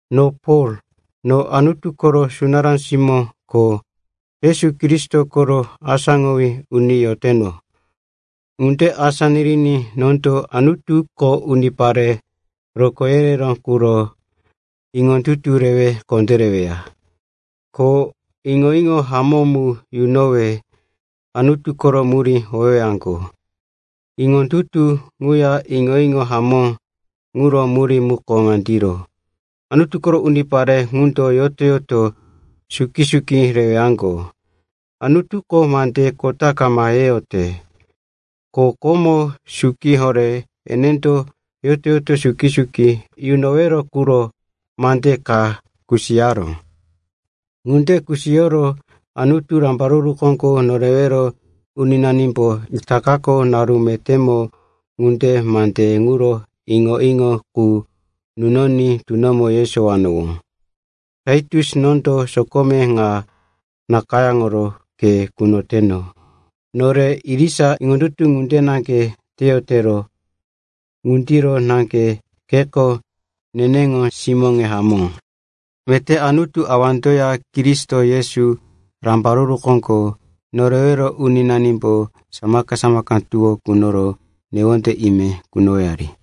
No Pol, no Anutu koro sunará simó ko Yesu Kristo koro asáŋowí uni yoteno. Ŋunde asá niriní nondo Anutuko unipare rokó yereró quro iŋondutuye rewe kondéreweya, ko iŋo-iŋo hamó mu yunowe Anutu koro murí howewaŋgo. Iŋondutu ŋuya iŋo-iŋo hamó ŋuro murí muko ŋandiro, Anutu koro unipare ŋundo yoto-yoto suki-suki rewaŋgo. Anutuko mande kota kama yeyote, ko komo suki horé enendo yoto-yoto suki-suki yunowero quro mande ka kusiyaró. Ŋunde kusiyoro Anutu, Rambaruru Koŋgo Norewero Uninanimbo itakako, naru metémo ŋundiro, mande ŋuro iŋo-iŋo qu nunoní tunomo yesowanowó. Taitus, nondo sokome ŋa nakayáŋoro ke kunoteno. Nore irisa iŋondutu ŋunde naŋge teyotero, ŋundiro naŋge keko neneŋo simóne hamó. Meté Anutu Awandoya Kristo Yesu, Rambaruru Koŋgo Norewero Uninanimboya samaka-samaka tuwó kunoro newonde ime kunowari.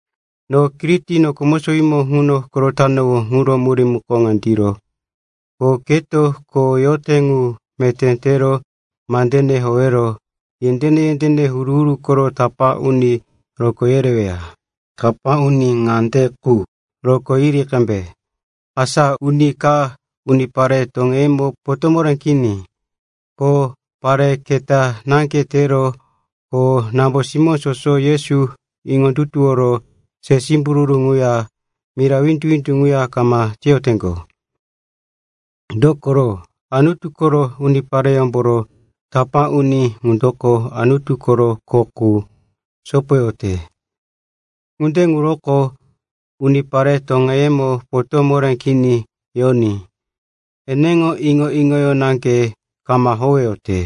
No Kiriti noko mosowímo ŋuno korotanowó ŋuro murí muko ŋandiro, ko keto kho yote ŋu meté tero mandene howero yendéne-yendéne huru-huru koro tapá uni rokó yereweya. Tapá uni ŋande qu rokó yiri qembe, asa uni ka unipare toŋeyemo potó moré kini, ko parí kanata naŋge taró. Ko nambo-simóŋo soso Yesu iŋondutuworo se simbururu ŋuya mira windu-windu ŋuya kama teyoteŋgo. Dokoro Anutu koro unipareyómboro tapá uni ŋundoko Anutu koro kho qu sopoyote. Ŋunde ŋuroko unipare toŋeyemo potó moré kini yoní. Eneŋo iŋo-iŋoyó naŋge kama howeyote,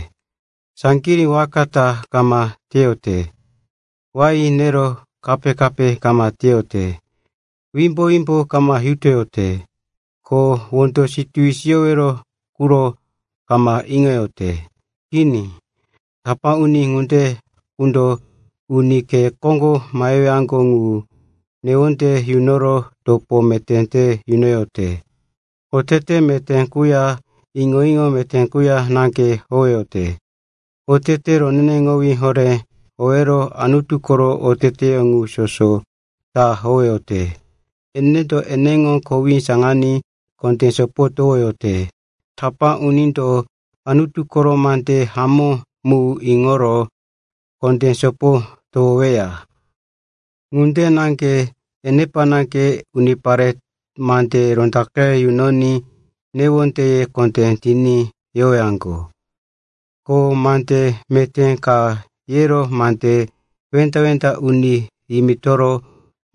saŋgirí waka ta kama teyote, wain nero kape-kape kama teyote, wimbo-wimbo kama yutoyote, ko wondo situwi siyowero quro kama iŋoyote. Kini, tapá uni ŋunde qundo uni khe koŋgo mahewaŋgo ŋu newonde yunoro topo meté te yunoyote. Otete meté quya iŋo-iŋo meté quya naŋge howeyote. Otete roneneŋowí horé howero Anutu koro oteteyó ŋu soso ta howeyote. Enendo eneŋo kowí saŋaní kondé sopo towoyote. Tapá unindo Anutu koro mande hamó mu iŋoro kondé sopo towoyoweya. Ŋunde naŋge enepa naŋge unipare mande rondaqe yunoní newondeye kondé tiní yowaŋgo. Ko mande meté ka yero mande wenda-wenda uni yimitoro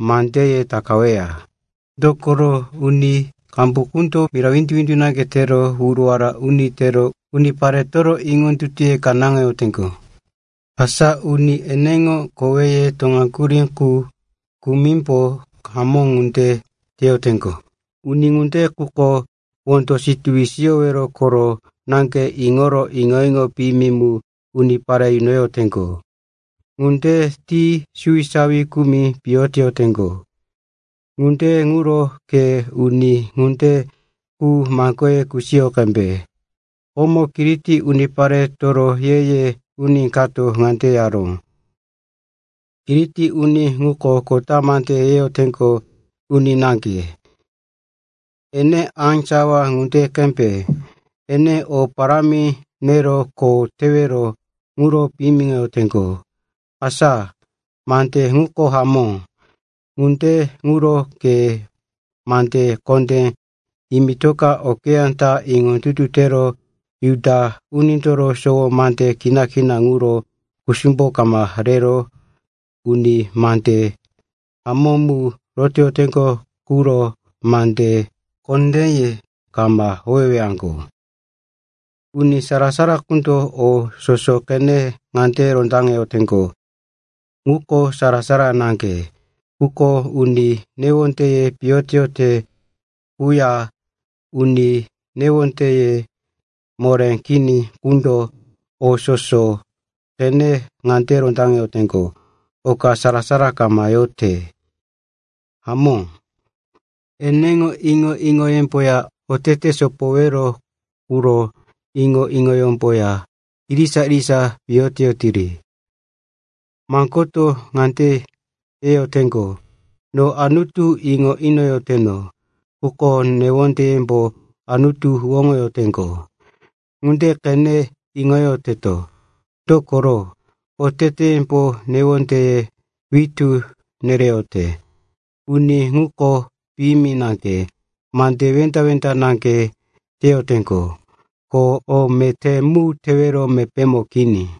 mandeye takaweya. Dokoro uni qambu qundo mira windu-windu naŋge tero wuruwara uni tero uniparetoro iŋondutuye kanáŋoyoteŋgo. Asa uni eneŋo koweye toŋaŋgurí qu kumimbo hamó ŋunde teyoteŋgo. Uni ŋunde quko wondo situwi siyowero koro naŋge iŋoro iŋo-iŋo piyimi mu unipare yunoyoteŋgo. Ŋunde ti suwisawi kumi piyo teyoteŋgo. Ŋunde ŋuro ke uni ŋunde qu maŋgoye kusiyo qembe. Komo Kiriti uniparetoro ye-ye uni kato ŋande yaró, “Kiriti uni ŋuko kota mande yeyoteŋgo uni naŋge. Ene á sawa ŋunde qembe. Ene o parámi nero kho tewero ŋuro piyimiŋoyoteŋgo.” Asa mande ŋuko hamó. Ŋunde ŋuro ke mande kondé yimitoka okeyá ta iŋondutu tero Juda unindoro sowo mande kina-kina ŋuro kusumbo kama rero uni mande hamó mu rotoyoteŋgo quro mande kondéye kama howewaŋgo. Uni sara-sara qundo o soso qenero ŋande rondaŋeyoteŋgo, ŋuko sara-sara naŋge. Quko uni newondeye piyo teyote quya uni iŋondutuye moré kini qundo o soso qenero ŋande rondaŋeyoteŋgo, oka sara-sara kama yote. Hamó, eneŋo iŋo-iŋoyemboya otete sopowero quro iŋo-iŋoyemboya irisa-irisa piyo teyotiri. Maŋgoto ŋande yeyoteŋgo, “No Anutu iŋo inoyoteno,” quko newondeyemo Anutu huwóŋoyoteŋgo. Ŋunde qene iŋoyoteto, dokoro oteteyembo newondeye witú nereyote. Uni ŋuko piyimi naŋge, mande wenda-wenda naŋge teyoteŋgo ko o meté mu tewero mepémo kini.